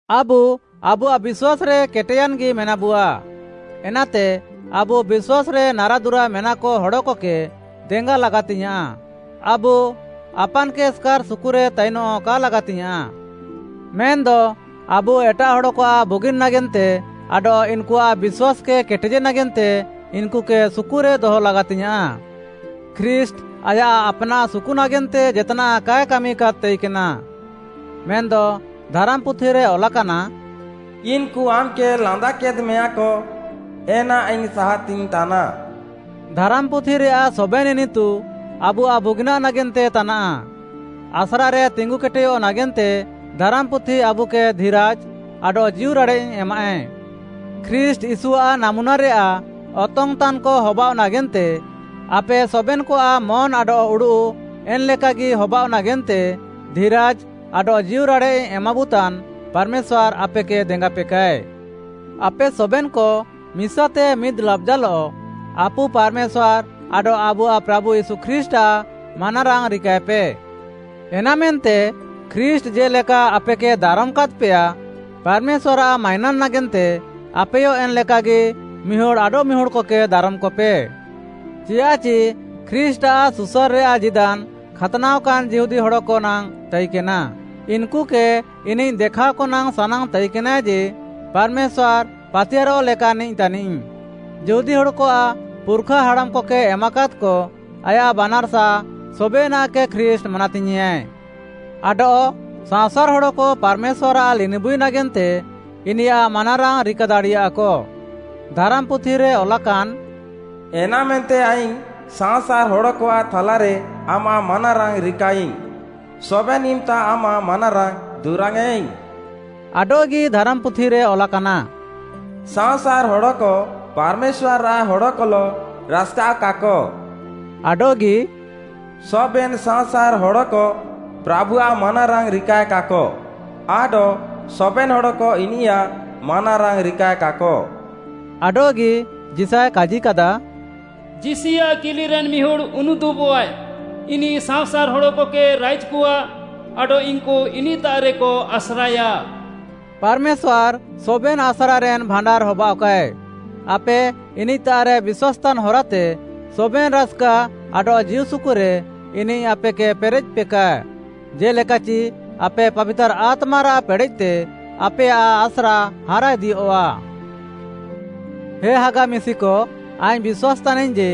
ଆବୁ ଆବୁଆଃ ବିଶ୍ୱାସ୍‌ରେ କେଟେୟାନ୍‌ଗି ମେନାବୁଆ, ଏନାତେ ଆବୁ ବିଶ୍ୱାସ୍‌ରେ ନାରାଦୁରା ମେନାକ ହଡ଼କକେ ଦେଙ୍ଗା ଲାଗାତିଙ୍ଗ୍‌ୟାଁଃ। ଆବୁ ଆପାନ୍‌କେ ଏସ୍‌କାର୍‌ ସୁକୁରେ ତାଇନଃ କା ଲାଗାତିଙ୍ଗ୍‌ୟାଁଃ। ମେନ୍‌ଦ ଆବୁ ଏଟାଃ ହଡ଼କଆଃ ବୁଗିନ୍‌ ନାଗେନ୍ତେ ଆଡଃ ଇନ୍‌କୁଆଃ ବିଶ୍ୱାସ୍‌କେ କେଟେଜେ ନାଗେନ୍ତେ ଇନ୍‌କୁକେ ସୁକୁରେ ଦହ ଲାଗାତିଙ୍ଗ୍‌ୟାଁଃ। ଖ୍ରୀଷ୍ଟ୍‌ ଆୟାଃ ଆପ୍‌ନାଃ ସୁକୁ ନାଗେନ୍ତେ ଜେତ୍‌ନାଃ କାଏ କାମି ତାଇକେନା, ମେନ୍‌ଦ ଧାରାମ୍‌ପୁଥିରେ ଅଲାକାନା, “ଇନ୍‌କୁ ଆମ୍‌କେ ଲାନ୍ଦାକେଦ୍‌ମେୟାଁକ, ଏନା ଆଇଙ୍ଗ୍‌ ସାହାତିଙ୍ଗ୍‌ତାନା।” ଧାରାମ୍‌ପୁଥିରେୟାଃ ସବେନ୍‌ ଇନିତୁ ଆବୁଆଃ ବୁଗିନାଃ ନାଗେନ୍ତେ ତାନାଃ, ଆସ୍ରାରେ ତିଙ୍ଗୁକେଟେୟଃ ନାଗେନ୍ତେ ଧାରାମ୍‌ପୁଥି ଆବୁକେ ଧିରାଜ୍‌ ଆଡଃ ଜୀଉରାଡ଼େଃ ଏମାଃଏ। ଖ୍ରୀଷ୍ଟ୍‌ ୟୀଶୁଆଃ ନାମୁନାରେୟାଃ ଅତଙ୍ଗ୍‌ତାନ୍‌କ ହବାଅଃ ନାଗେନ୍ତେ ଆପେ ସବେନ୍‌କଆଃ ମନ୍‌ ଆଡଃ ଉଡ଼ୁଃ, ଏନ୍‌ ଲେକାଗି ହବାଅଃ ନାଗେନ୍ତେ ଧିରାଜ୍‌ ଆଡଃ ଜୀଉରାଡ଼େଃ ଏମାବୁତାନ୍‌ ପାର୍‌ମେଶ୍ୱାର୍‌ ଆପେକେ ଦେଙ୍ଗାପେକାଏ। ଆପେ ସବେନ୍‌କ ମିସାତେ ମିଦ୍‌ ଲାବ୍‌ଜାଲଃ ଆପୁ ପାର୍‌ମେଶ୍ୱାର୍‌ ଆଡଃ ଆବୁଆଃ ପ୍ରାଭୁ ୟୀଶୁ ଖ୍ରୀଷ୍ଟ୍‌ଆଃ ମାନାରାଙ୍ଗ୍‌ ରିକାଏପେ। ଏନାମେନ୍ତେ ଖ୍ରୀଷ୍ଟ୍‌ ଜେ'ଲେକା ଆପେକେ ଦାରମ୍‌କାଦ୍‌ପେୟା, ପାର୍‌ମେଶ୍ୱାର୍‌ଆଃ ମାଇନାନ୍‌ ନାଗେନ୍ତେ ଆପେୟ ଏନ୍‌ ଲେକାଗି ମିହୁଡ଼୍‌ ଆଡଃମିହୁଡ଼୍‌କକେ ଦାରମ୍‌କପେ। ଚିଆଃଚି ଖ୍ରୀଷ୍ଟ୍‌ଆଃ ସୁସାର୍‌ରେୟାଃ ଜୀଦାନ୍‌ ଖାତ୍‌ନାଅକାନ୍ ଯିହୁଦୀ ହଡ଼କ ନାଙ୍ଗ୍‌ ତାଇକେନା। ଇନ୍‌କୁକେ ଇନିଃ ଦେଖାଅକ ନାଙ୍ଗ୍‌ ସାନାଙ୍ଗ୍‌ ତାଇକେନାଏ ଯେ ପାର୍‌ମେଶ୍ୱାର୍‌ ପାତିୟାର୍‌ରଃ ଲେକାନ୍‌ନିଃ ତାନିଃ। ଯିହୁଦୀ ହଡ଼କଆଃ ପୁର୍‌ଖା ହାଡ଼ାମ୍‌କକେ ଏମାକାଦ୍‌କ ଆୟାଃ ବାନାର୍‌ସା ସବେନାଃକେ ଖ୍ରୀଷ୍ଟ୍‌ ମାନାତିୟେଁଆଏ। ଆଡଃ ସାଅଁସାର୍‌ ହଡ଼କ ପାର୍‌ମେଶ୍ୱାର୍‌ଆଃ ଲିନିବୁଇ ନାଗେନ୍ତେ ଇନିୟାଃ ମାନାରାଙ୍ଗ୍‌ ରିକା ଦାଡ଼ିୟାଃକ। ଧାରାମ୍‌ପୁଥିରେ ଅଲାକାନ୍‌, “ଏନାମେନ୍ତେ ଆଇଙ୍ଗ୍‌ ସାଅଁସାର୍‌ ହଡ଼କଆଃ ଥାଲାରେ ଆମାଃ ମାନାରାଙ୍ଗ୍‌ ରିକାୟାଇଙ୍ଗ୍‌, ସବେନ୍‌ ଇମ୍‌ତା ଆମାଃ ମାନାରାଙ୍ଗ୍‌ ଦୁରାଙ୍ଗ୍‌ୟେଁଇଙ୍ଗ୍‌।” ଆଡଃଗି ଧାରାମ୍‌ପୁଥିରେ ଅଲାକାନା, “ସାଅଁସାର୍‌ ହଡ଼କ ପାର୍‌ମେଶ୍ୱାର୍‌ଆଃ ହଡ଼କଲଃ ରାସ୍‌କାଅଃକାକ।” ଆଡଃଗି, “ସବେନ୍‌ ସାଅଁସାର୍‌ ହଡ଼କ ପ୍ରାଭୁଆଃ ମାନାରାଙ୍ଗ୍‌ ରିକାଏକାକ। ଆଡଃ ସବେନ୍‌ ହଡ଼କ ଇନିୟାଃ ମାନାରାଙ୍ଗ୍‌ ରିକାଏକାକ।” ଆଡଃଗି, ଯିଶାୟ କାଜିକାଦା, “ଯିଶିଆଃ କିଲିରେନ୍‌ ମିହୁଡ଼୍‌ ଉନୁଦୁବଃଆଏ, ଇନିଃ ସାଅଁସାର୍‌ ହଡ଼କକେ ରାଇଜ୍‌କଆ ଆଡଃ ଇନ୍‌କୁ ଇନିଃତାଃରେକ ଆସ୍ରାଏୟା।” ପାର୍‌ମେଶ୍ୱାର୍‌ ସବେନ୍‌ ଆସ୍ରାରେନ୍‌ ଭାଣ୍ଡାର୍‌ ହବାଅଃକାଏ, ଆପେ ଇନିଃତାଃରେ ବିଶ୍ୱାସ୍‌ତାନ୍‌ ହରାତେ ସବେନ୍‌ ରାସ୍‌କା ଆଡଃ ଜୀଉସୁକୁରେ ଇନିଃ ଆପେକେ ପେରେଃପେକା, ଜେ'ଲେକାଚି ଆପେ ପାବିତାର୍‌ ଆତ୍ମାରାଃ ପେଡ଼େଃତେ ଆପେୟାଃ ଆସ୍ରା ହାରାଇଦିୟଃଆ। ହେ ହାଗା ମିଶିକ, ଆଇଙ୍ଗ୍‌ ବିଶ୍ୱାସ୍‌ ତାନାଇଙ୍ଗ୍‌ ଯେ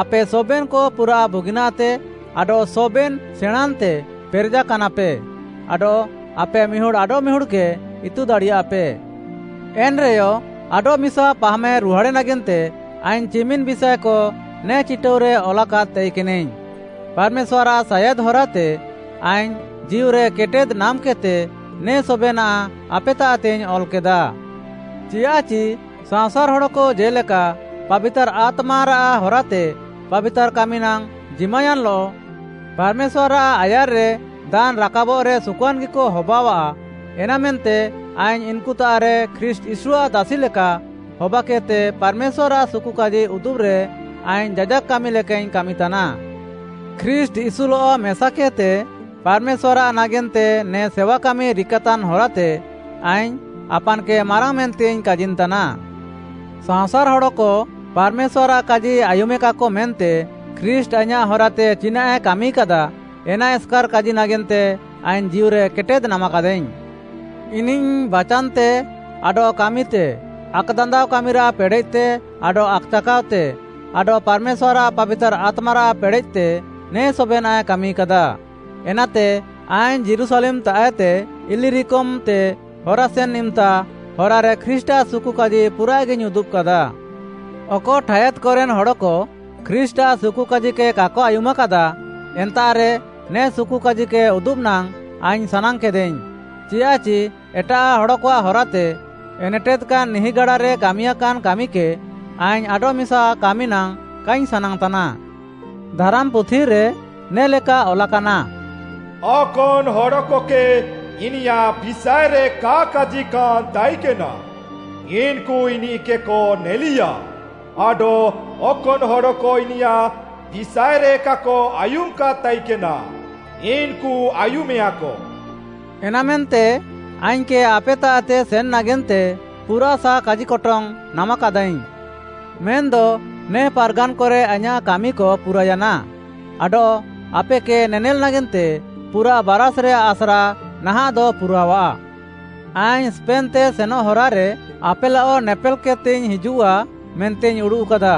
ଆପେ ସବେନ୍‌କ ପୁରାଃ ବୁଗିନାଃତେ, ଆଡଃ ସବେନ୍‌ ସେଣାଁଁନ୍‌ତେ ପେରେଜାକାନାପେ, ଆଡଃ ଆପେ ମିହୁଡ଼୍‌ ଆଡଃମିହୁଡ଼୍‌କେ ଇତୁ ଦାଡ଼ିୟାଃପେ। ଏନ୍‌ରେୟ ଆଡଃମିସା ପାହାମ୍‌ରୁହାଡ଼େ ନାଗେନ୍ତେ ଆଇଙ୍ଗ୍‌ ଚିମିନ୍‌ ବିଷାଏକ ନେ ଚିଟାଉରେ ଅଲାକାଦ୍‌ ତାଇକେନାଇଙ୍ଗ୍‌, ପାର୍‌ମେଶ୍ୱାର୍‌ଆଃ ସାୟାଦ୍‌ ହରାତେ ଆଇଙ୍ଗ୍‌ ଜୀଉରେ କେଟେଦ୍‌ ନାମ୍‌କେଦ୍‌ତେ ନେ ସବେନାଃ ଆପେତାଃତେଇଙ୍ଗ୍‌ ଅଲ୍‌କେଦା। ଚିୟାଃଚି ସାଅଁସାର୍‌ ହଡ଼କ ଜେ'ଲେକା ପାବିତାର୍‌ ଆତ୍ମାରାଃ ହରାତେ ପାବିତାର୍‌ କାମି ନାଙ୍ଗ୍‌ ଜିମାୟାନ୍‌ଲଃ ପାର୍‌ମେଶ୍ୱାର୍‌ଆଃ ଆୟାର୍‌ରେ ଦାନ୍‌ ରାକାବଃରେ ସୁକୁଆନ୍‌ଗିକ ହବାଅଃଆ, ଏନାମେନ୍ତେ ଆଇଙ୍ଗ୍‌ ଇନ୍‌କୁତାଃରେ ଖ୍ରୀଷ୍ଟ୍‌ ୟୀଶୁଆଃ ଦାସି ଲେକା ହବାକେଦ୍‌ତେ ପାର୍‌ମେଶ୍ୱାର୍‌ଆଃ ସୁକୁକାଜି ଉଦୁବ୍‌ରେ, ଆଇଙ୍ଗ୍‌ ଯାଜାକ୍‌ କାମି ଲେକାଇଙ୍ଗ୍‌ କାମିତାନା। ଖ୍ରୀଷ୍ଟ୍‌ ୟୀଶୁଲଃ ମେସାକେଦ୍‌ତେ ପାର୍‌ମେଶ୍ୱାର୍‌ଆଃ ନାଗେନ୍ତେ ନେ ସେୱାକାମି ରିକାତାନ୍‌ ହରାତେ ଆଇଙ୍ଗ୍‌ ଆପାନ୍‌କେ ମାରାଙ୍ଗ୍‌ ମେନ୍ତେଇଙ୍ଗ୍‌ କାଜିନ୍‌ତାନା। ସାଅଁସାର୍‌ ହଡ଼କ ପାର୍‌ମେଶ୍ୱାର୍‌ଆଃ କାଜି ଆୟୁମେକାକ ମେନ୍ତେ ଖ୍ରୀଷ୍ଟ୍‌ ଆଇଁୟାଃ ହରାତେ ଚିନାଃଏ କାମିକାଦା, ଏନା ଏସ୍‌କାର୍‌ କାଜି ନାଗେନ୍ତେ ଆଇଙ୍ଗ୍‌ ଜୀଉରେ କେଟେଦ୍‌ ନାମାକାଦାଇଙ୍ଗ୍‌। ଇନିଃ ବାଚାନ୍‌ତେ ଆଡଃ କାମିତେ ଆକ୍‌ଦାନ୍ଦାଅ କାମିରାଃ ପେଡ଼େଃତେ ଆଡଃ ଆକ୍‌ଚାକାଅତେ, ଆଡଃ ପାର୍‌ମେଶ୍ୱାର୍‌ଆଃ ପାବିତାର୍‌ ଆତ୍ମାରାଃ ପେଡ଼େଃତେ ନେ ସବେନାଃଏ କାମିକାଦା। ଏନାତେ ଆଇଙ୍ଗ୍‌ ଯୀରୁଶାଲେମ୍‌ତାଃଏତେ ଇଲିରିକମ୍‌ତେ ହରାସେନ୍‌ ଇମ୍‌ତା ହରାରେ ଖ୍ରୀଷ୍ଟ୍‌ଆଃ ସୁକୁକାଜି ପୁରାଃଗିଇଙ୍ଗ୍‌ ଉଦୁବ୍‌କାଦା। ଅକ ଠାୟାଦ୍‌କରେନ୍‌ ହଡ଼କ ଖ୍ରୀଷ୍ଟ୍‌ଆଃ ସୁକୁକାଜିକେ କାକ ଆୟୁମାକାଦା, ଏନ୍ତାଃରେ ନେ ସୁକୁକାଜିକେ ଉଦୁବ୍‌ ନାଙ୍ଗ୍‌ ଆଇଙ୍ଗ୍‌ ସାନାଙ୍ଗ୍‌କେଦାଇଙ୍ଗ୍‌, ଚିଆଃଚି ଏଟାଃ ହଡ଼କଆଃ ହରାତେ ଏନେଟେଦ୍‌କାନ୍‌ ନିହିଁଗାଡାରେ କାମିୟାକାନ୍‌ କାମିକେ ଆଇଙ୍ଗ୍‌ ଆଡଃମିସା କାମି ନାଙ୍ଗ୍‌ କାଇଙ୍ଗ୍‌ ସାନାଙ୍ଗ୍‌ତାନା। ଧାରାମ୍‌ପୁଥିରେ ନେ'ଲେକା ଅଲାକାନା, “ଅକନ୍‌ ହଡ଼କକେ ଇନିୟାଃ ବିଷାଏରେ କା କାଜିକାନ୍‌ ତାଇକେନା, ଇନ୍‌କୁ ଇନିଃକେକ ନେଲିୟା ଆଡଃ ଅକନ୍‌ ହଡ଼କ ଇନିୟାଃ ବିଷାଏରେ କାକ ଆୟୁମାକାଦ୍‌ ତାଇକେନା, ଇନ୍‌କୁ ଆୟୁମେଆକ।” ଏନାମେନ୍ତେ ଆଇଙ୍ଗ୍‌କେ ଆପେତାଃତେ ସେନ୍‌ ନାଗେନ୍ତେ ପୁରାଃସାଃ କାଜିକଟଙ୍ଗ୍‌ ନାମାକାଦାଇଙ୍ଗ୍‌। ମେନ୍‌ଦ ନେ ପାର୍‌ଗାନ୍‌କରେ ଆଇଁୟାଃ କାମିକ ପୁରାୟାନା ଆଡଃ ଆପେକେ ନେନେଲ୍‌ ନାଗେନ୍ତେ ପୁରାଃ ବାରାଷ୍‌ରେୟାଃ ଆସ୍ରା ନାହାଃଁଦ ପୁରାଅଃଆ। ଆଇଙ୍ଗ୍‌ ସ୍ପେନ୍‌ତେ ସେନଃ ହରାରେ ଆପେଲଃ ନେପେଲ୍‌କେଦ୍‌ତେଇଙ୍ଗ୍‌ ହିଜୁଃଆ ମେନ୍ତେଇଙ୍ଗ୍‌ ଉଡ଼ୁଃକାଦା।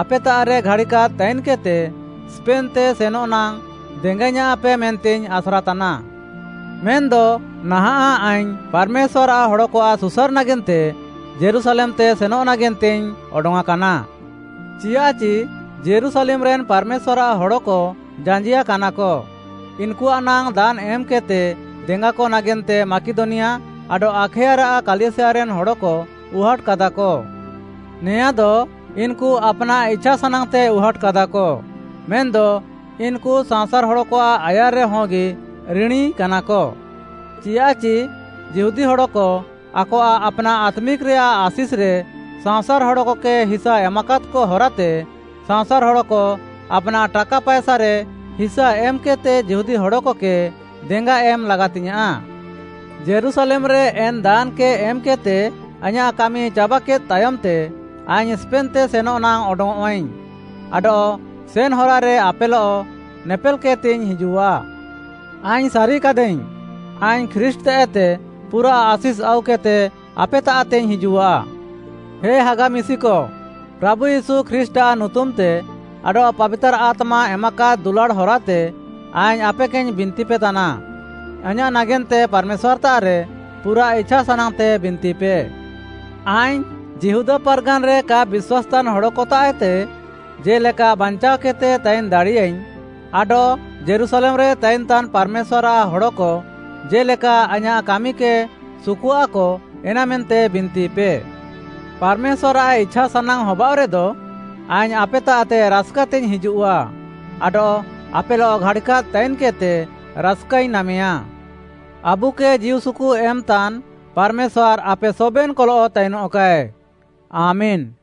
ଆପେତାଃରେ ଘାଡ଼ିକାଦ୍‌ ତାଇନ୍‌କେଦ୍‌ତେ ସ୍ପେନ୍‌ତେ ସେନଃ ନାଙ୍ଗ୍‌ ଦେଙ୍ଗାଇୟାଁଃପେ ମେନ୍ତେଇଙ୍ଗ୍‌ ଆସ୍ରାତାନା। ମେନ୍‌ଦ ନାହାଁଃ ଆଇଙ୍ଗ୍‌ ପାର୍‌ମେଶ୍ୱାର୍‌ଆଃ ହଡ଼କଆଃ ସୁସାର୍‌ ନାଗେନ୍ତେ ଯୀରୁଶାଲେମ୍‌ତେ ସେନଃ ନାଗେନ୍ତେଇଙ୍ଗ୍‌ ଅଡଙ୍ଗ୍‌ଆଁକାନା। ଚିଆଃଚି ଯୀରୁଶାଲେମ୍‌ରେ ପାର୍‌ମେଶ୍ୱାର୍‌ଆଃ ହଡ଼କ ଜାଞ୍ଜିଆକାନାକ, ଇନ୍‌କୁଆଃ ନାଙ୍ଗ୍‌ ଦାନ୍‌ ଏମ୍‌କେଦ୍‌ତେ ଦେଙ୍ଗାକ ନାଗେନ୍ତେ ମାକିଦନିଆ ଆଡଃ ଆଖାୟାରାଃ କାଲିସିୟାରେନ୍‌ ହଡ଼କ ଉହାଟ୍‌କାଦାକ। ନେଆଁଦ ଇନ୍‌କୁ ଆପ୍‌ନାଃ ଇଛାସାନାଙ୍ଗ୍‌ତେ ଉହାଟ୍‌କାଦାକ, ମେନ୍‌ଦ ଇନ୍‌କୁ ସାଅଁସାର୍‌ ହଡ଼କଆଃ ଆୟାର୍‌ରେ ହଗି ରିଣୀକାନାକ, ଚିଆଃଚି ଯିହୁଦୀ ହଡ଼କ ଆକଆଃ ଆପ୍‌ନାଃ ଆତ୍ମିକ୍‌ରେୟାଃ ଆଶିଷ୍‌ରେ ସାଅଁସାର୍‌ ହଡ଼କକେ ହିସା ଏମାକାଦ୍‌କ ହରାତେ, ସାଅଁସାର୍‌ ହଡ଼କ ଆପ୍‌ନାଃ ଟାକା ପାଏସାରେ ହିସା ଏମ୍‌କେଦ୍‌ତେ ଯିହୁଦୀ ହଡ଼କକେ ଦେଙ୍ଗା ଏମ୍‌ ଲାଗାତିଙ୍ଗ୍‌ୟାଁଃ। ଯୀରୁଶାଲେମ୍‌ରେ ଏନ୍‌ ଦାନ୍‌କେ ଏମ୍‌କେଦ୍‌ତେ ଆଇଁୟାଃ କାମି ଚାବାକେଦ୍‌ ତାୟମ୍‌ତେ, ଆଇଙ୍ଗ୍‌ ସ୍ପେନ୍‌ତେ ସେନଃନାଙ୍ଗ୍‌ ଅଡଙ୍ଗ୍‌ଅଃଆଇଙ୍ଗ୍‌ ଆଡଃ ସେନ୍‌ହରାରେ ଆପେଲଃ ନେପେଲ୍‌ କେଦ୍‌ତେଇଙ୍ଗ୍‌ ହିଜୁଃଆ। ଆଇଙ୍ଗ୍‌ ସାରିକାଦାଇଙ୍ଗ୍‌, ଆଇଙ୍ଗ୍‌ ଖ୍ରୀଷ୍ଟ୍‌ତାଃଏତେ ପୁରାଃ ଆଶିଷ୍‌ ଆଉକେଦ୍‌ତେ ଆପେତାଃତେଇଙ୍ଗ୍‌ ହିଜୁଃଆ। ହେ ହାଗା ମିଶିକ, ପ୍ରାଭୁ ୟୀଶୁ ଖ୍ରୀଷ୍ଟ୍‌ଆଃ ନୁତୁମ୍‌ତେ ଆଡଃ ପାବିତାର୍‌ ଆତ୍ମା ଏମାକାଦ୍ ଦୁଲାଡ଼୍‌ ହରାତେ ଆଇଙ୍ଗ୍‌ ଆପେକେଇଙ୍ଗ୍‌ ବିନ୍ତିପେ ତାନା, ଆଇଁୟାଃ ନାଗେନ୍ତେ ପାର୍‌ମେଶ୍ୱାର୍‌ତାଃରେ ପୁରାଃ ଇଛାସାନାଙ୍ଗ୍‌ତେ ବିନ୍ତିପେ। ଆଇଙ୍ଗ୍‌ ଯିହୁଦା ପାର୍‌ଗାନ୍‌ରେ କା ବିଶ୍ୱାସ୍‌ତାନ୍‌ ହଡ଼କତାଃଏତେ ଜେ'ଲେକା ବାଞ୍ଚାଅକେଦ୍‌ତେ ତାଇନ୍‌ ଦାଡ଼ିୟାଇଙ୍ଗ୍‌ ଆଡଃ ଯୀରୁଶାଲେମ୍‌ରେ ତାଇନ୍‌ତାନ୍ ପାର୍‌ମେଶ୍ୱାର୍‌ଆଃ ହଡ଼କ ଜେ'ଲେକା ଆଇଁୟାଃ କାମିକେ ସୁକୁଃଆକ ଏନାମେନ୍ତେ ବିନ୍ତିପେ। ପାର୍‌ମେଶ୍ୱାର୍‌ଆଃ ଇଛାସାନାଙ୍ଗ୍‌ ହବାଅଃରେଦ, ଆଇଙ୍ଗ୍‌ ଆପେତାଃତେ ରାସ୍‌କାତେଇଙ୍ଗ୍‌ ହିଜୁଃଆ ଆଡଃ ଆପେଲଃ ଘାଡ଼ିକାଦ୍‌ ତାଇନ୍‌କେଦ୍‌ତେ ରାସ୍‌କାଇଙ୍ଗ୍‌ ନାମେୟା। ଆବୁକେ ଜୀଉସୁକୁ ଏମ୍‌ତାନ୍‌ ପାର୍‌ମେଶ୍ୱାର୍‌ ଆପେ ସବେନ୍‌କଲଃ ତାଇନଃକାଏ। ଆମେନ୍‌।